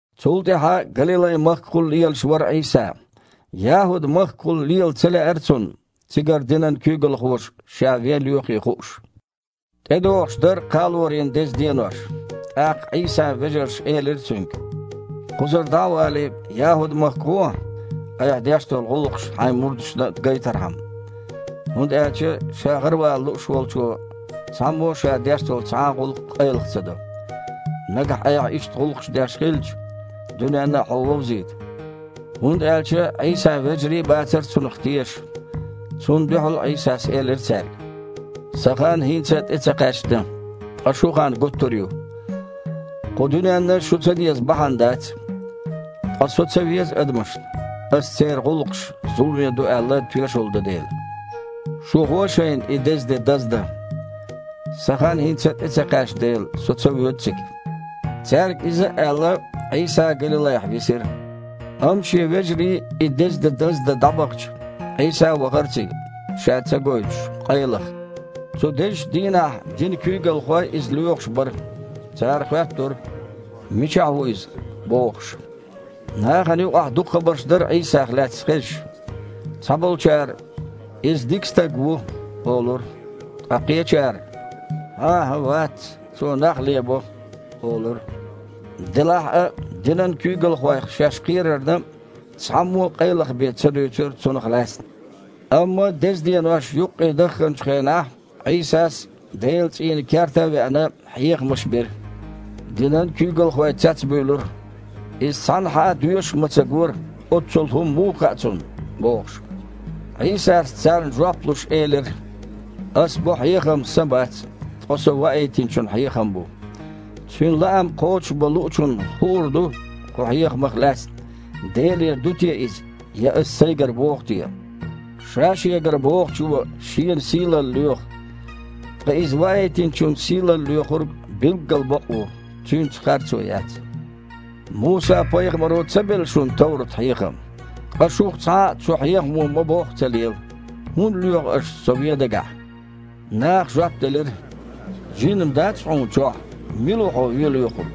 Цул тІаьхьа Галилай-махкахула лелаш вара Іийса. ЯхІуд-махкахула лела ца лаьара Цунна, цигара динан куьйгалхоша Ша вен лоьхий хууш. ТІедогІуш дара Кхалорийн деза денош. ТІаккха Іийсан вежарша элира Цуьнга: «Кхузара дІа а валий, ЯхІуд-махка гІохьа, Айхьа деш долу гІуллакхаш Хьайн мурдашна а гайтархьама. ХІунда аьлча ша гІаравала лууш волчу цхьаммо а ша деш долу цхьа а гІуллакх къайлаха ца до. Нагахь Айхьа иштта гІуллакхаш деш хилча, дуьненна а Хьо вовзийта». ХІунда аьлча Іийсан вежарий а бацара Цунах тешаш. Цунна дуьхьал Іийсас элира цаьрга: «Сан хан хІинца а тІе ца кхаьчна, ткъа шун хан гуттара а ю. Кху дуьненна шу ца деза бахьана дац. Ткъа Со ца веза адамашна, Ас церан гІуллакхаш зуламе ду аьлла, тоьшалла до дела. Шу гІо шайна и деза де даздан. Сан хан хІинца а тІе ца кхаьчна дела, Со ца воьду цига». Цаьрга иза а аьлла, Іийса Галилайхь висира. Амма Шен вежарий и деза де даздан дІабахча, Іийса а вахара цига, Ша ца гойтуш, къайлаха. Цу дезачу дийнахь динан куьйгалхой Иза лоьхуш бара. Цара хоьттура: «Мичахь ву Иза?» – бохуш. Нахана юкъахь дукха хабарш дара Іийсах лаьцна хезаш. Цхьаболчара: «Иза дика стаг ву», – олура, ткъа кхечара: «ХІан-хІа вац, Цо нах лебо», – олура. Делахь а динан куьйгалхойх шаьш кхерарна, цхьаммо а къайлаха бен ца дуьйцура Цунах лаьцна. Амма деза денош юккъе дахханчу хенахь Іийсас, Делан цІийнан керта а вахана, хьехамаш бира. Динан куьйгалхой цецбуьйлура: «Иза цхьанхьа а доьшуш ма ца гора, оццул хІума муха хаьа Цунна?» – бохуш. Іийсас, царна жоп луш, элира: «Ас бо хьехам Сан бац, ткъа Со Ваийтинчун хьехам бу. Цуьнан лаам кхочушбан луучунна хуур ду кху хьехамах лаьцна, Делера ду те иза, я Ас Сайгара боху те. Ша-шегара бохучо шена сийлалла лоьху. Ткъа Иза Ваийтинчун сийлалла лоьхург билггал бакъ ву, Цуьнца харцо яц. Муса-пайхамаро ца белла шуна товрат-хьехам? Ткъа шух цхьа а цу хьехамо ма-бохху ца лела. ХІунда лоьху аш Со вен дагахь?» Наха жоп делира: «Жин-м дац Хьуна чохь? Мила ву Хьо вен лоьхург?»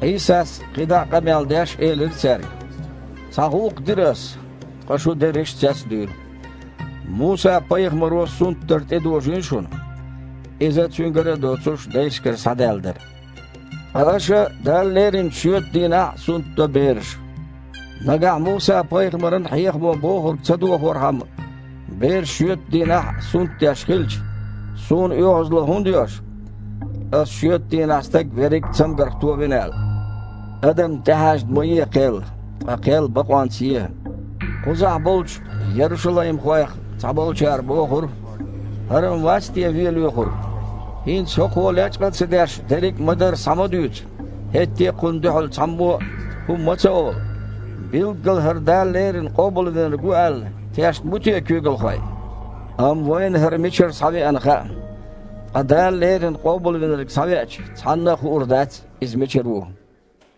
Іийсас, кхин дІа а къамел деш, элира цаьрга: «Цхьа гІуллакх дира Ас, ткъа шу дерриш а цецдуьйлу. Муса-пайхамаро сунтдар тІедожийна шуна, (иза цуьнгара а доцуш, дайшкара схьадаьлла дара). Ткъа аша Далла леринчу шоьтан дийнахь а сунтдо бераш. Нагахь Муса-пайхамаран хьехамо бохург ца дохорхьама, бераш шоьтан дийнахь а сунтдеш хилча, Суна оьгІазло хІунда йо аша, Аса шоьтан дийнахь стаг верриг а цамгарх товина аьлла? Адамна тІехьаьжна ма е кхел, ткъа кхел бакъонца е». Кхузахь болчу ярушалаймхойх цхьаболчара бохура: «ХІара-м вац те вен лоьхург? ХІинца ХІокхо, лечкъа ца деш, дерриг ма-дарра схьа ма дуьйцу, хІетте а Кхунна дуьхьал цхьаммо а хІума ма ца олу. Билггала ХІара Дала леррина Къобалвинарг ву аьлла, тешна бу те куьйгалхой? Амма вайна ХІара мичара схьавеана хаьа. Ткъа Дала леррина Къобалвинарг схьавеача, цхьанна а хуур дац, Иза мичара ву».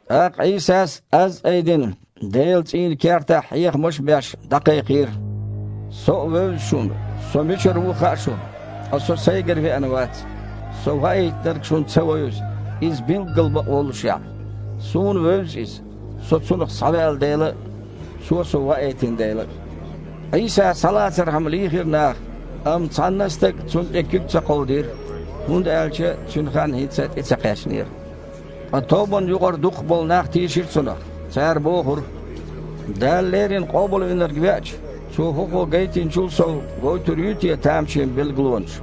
ТІаккха Іийсас, аз а айдина, Делан цІийнан кертахь хьехамаш а беш, дІакхайкхийра: «Со а вевза шуна, Со мичара ву а хаьа шуна. Ткъа Со Сайгара веана вац. Со Ваийтинарг шуна ца вевза, Иза билггал бакъ воллушехь. Суна вевза Иза, Со Цунах схьаваьлла дела а, Цо Со ваийтина дела а». Іийса схьалацархьама лийхира наха, амма цхьанна а стага Цунна тІе куьг ца кховдийра, хІунда аьлча Цуьнан хан хІинца а тІе ца кхаьчнера. Ткъа тобанна юкъара дукхах болу нах тийшира Цунах. Цара бохура: «Дала леррина Къобалвинарг веача, Цо ХІокхо гайтинчул сов гойтур юй те тамашийна билгалонаш?»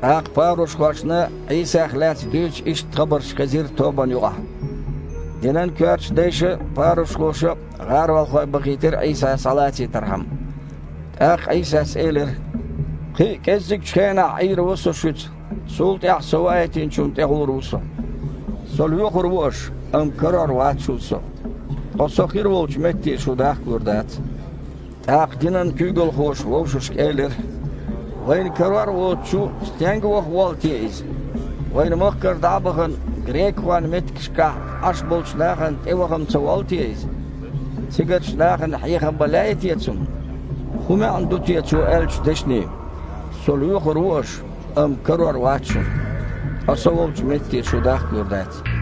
ТІаккха парушхошна Іийсах лаьцна дуьйцу иштта хабарш хезира тобанна юкъахь. Динан коьртачу дайша а, парушхоша а гІаролхой бахийтира Іийса схьалацийтархьама. ТІаккха Іийсас элира: «Кхин а кІеззигчу хенахь Іийр ву Со шуьца, цул тІаьхьа Со Ваийтинчунна тІе гІур ву Со. Со лоьхур ву аша, амма карор вац шуна Со, ткъа Со хир волчу метте шу дахкалур дац». ТІаккха динан куьйгалхоша вовшашка элира: «Вайна карор а воцучу, стенга ваха воллу те Иза? Вайн махкара дІа а бахана, грекахойн меттигашкахь Іаш болчу нахана тІеваха-м ца воллу те Иза? Цигарчу нахана хьехам бан лаьий те Цунна? ХІун маьІна ду те Цо аьллачу дешнийн: „Со лоьхур ву аша, амма карор вац шуна, ткъа Со волчу метте шу дахкалур дац“?»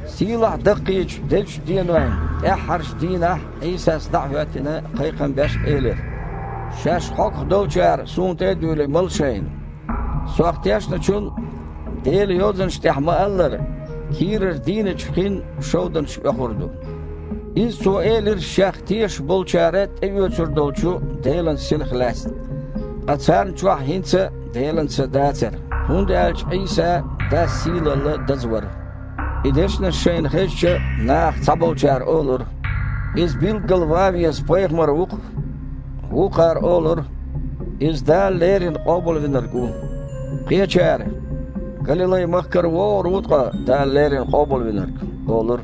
Сийлахь-доккхачу дезачу денойн тІаьххьарчу дийнахь Іийсас, дІа а хІоьттина, кхайкхам беш, элира: «Шаьш хьогах долчара, Суна тІе а дуьйлий, мала шайна. Сох тешначун, Делан Йозанашна тІехь ма-аллара, кийрара „дийначу хин“ шовданаш оьхур ду». Иза Цо элира Шех тешаш болчара тІеоьцур долчу Делан Синах лаьцна. Ткъа царна чохь хІинца а Делан Са дацара, хІунда аьлча Іийса Дас сийлалла даза вара. И дешнаш шайна хезча, нахах цхьаболчара олура: «Иза билггал ван веза пайхамар ву-кх». Вукхара олура: «Иза Дала леррина Къобалвинарг ву». Кхечара: «Галилай-махкара вогІур ву ткъа Дала леррина Къобалвинарг?» – олура.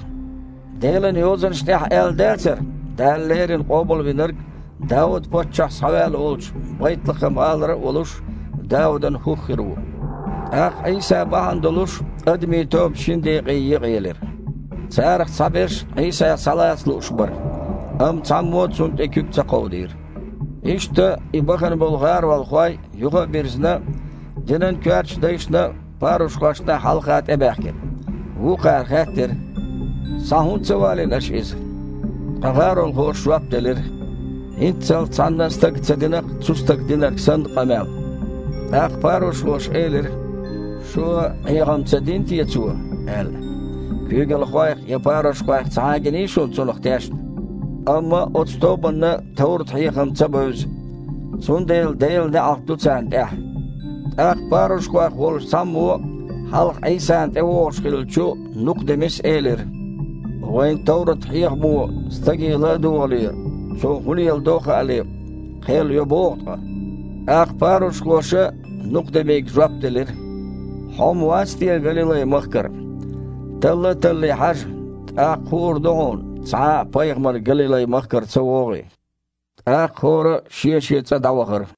«Делан Йозанаш тІехь а аьлла дацара Дала леррина Къобалвинарг, Дауд-паччахь схьаваьлла волчу Байтлахам-гІалара а волуш, Даудан хІух хир ву?» ТІаккха Іийса бахьана долуш адамийн тоба шина декъе екъаелира. Царах цхьаберш Іийса схьалаца лууш бара, амма цхьаммо а Цунна тІе куьг ца кховдийра. Иштта и бахана болу гІаролхой, юха а бирзина, динан коьртачу дайшна а, парушхошна а хьалха тІебаьхкира. Вукхара хаьттира: «Схьа хІунда ца валийна аша Иза?» Ткъа гІаролхоша жоп делира: «ХІинццалц цхьанна а стага ца дина-кх цу Стага динарг санна къамел». ТІаккха парушхоша элира: «Шу а Іеха-м ца дина те Цо? – аьлла. – Куьйгалхойх я парушхойх цхьа а гиний шуна Цунах тешна? Амма оцу тобанна товрат-хьехам ца бевза, цундела Делан неІалт ду царна тІехь». ТІаккха парушхойх волчу цхьаммо, хьалха Іийсана тІевогІуш хиллачу Нукха-Демис, элира: «Вайн товрат-хьехамо стаге ла а догІале, цо хІун леладо а хаале, кхел йо боху ткъа?» ТІаккха парушхоша Нукха-Демига жоп делира: «Хьо-м вац те Галилай-махкара? Талла а таллий, хьажа, тІаккха хуур ду хьуна, цхьа а пайхамар Галилай-махкара ца вогІий». ТІаккха хІора а шен-шен цІа дІавахара.